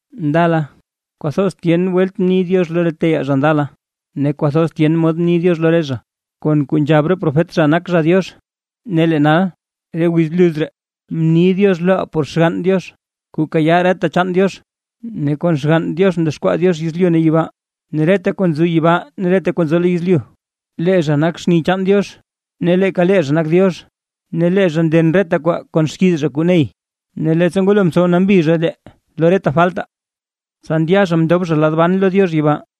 Ndala, kwathoz tyen welt mni Diox lo re teyaa zha ndala, ne kwathoz tyen mod mni Diox lo re zha, kon kuu nzhab re profet zha nak zha Diox; ne lee nal, re wiz bluz ree, mni Diox loʼaa por Xgann Diox kuu kayaa reta chaan Diox, ne kon Xgann Diox mdexkwaa Diox yezlyu ne yibaa, ne reta kuu nzo yibaa ne reta kuu nzo lo yezlyu. Lee zha nak xni chaan Diox, ne leeka lee zha nak Diox; ne lee zha nden reta kwaa kon xkiiz zha kuu ney. Ne leettsa ngwalo mtsow nambi zha lee lo re faltaa, tsa ndya zha mndob zha lad ban lo Diox yibaa.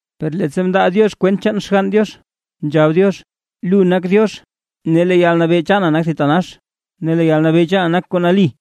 Per leettsa ndaa Diox kwent chaan Xgann Diox, nzhab Diox: Lu nak Diox ne lee yalnabee chaana nak thitanax, ne lee yalnabee chaana nak kuu nali.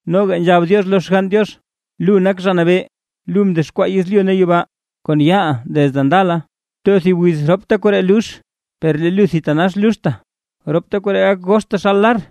Noga nzhab Diox lo Xgann Diox: Lu, nak Zha Nabee, lu mdexkwaa yezlyu ne yibaa kon yaaʼa desde ndala. Too thib wiz ropta koree lux, per lee lu thitanax luxta. Ropta koree gak gox taxal lar,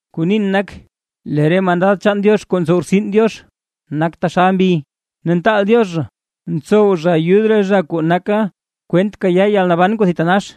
Kuu nin nak: Lee re mandad chaan Diox kuu ntsow rtsin Diox, nak taxal mbi, ne ntaal Diox zha ntsow zha ayud re zha kuu naka kwent kayaa yalnaban kuu thitanax.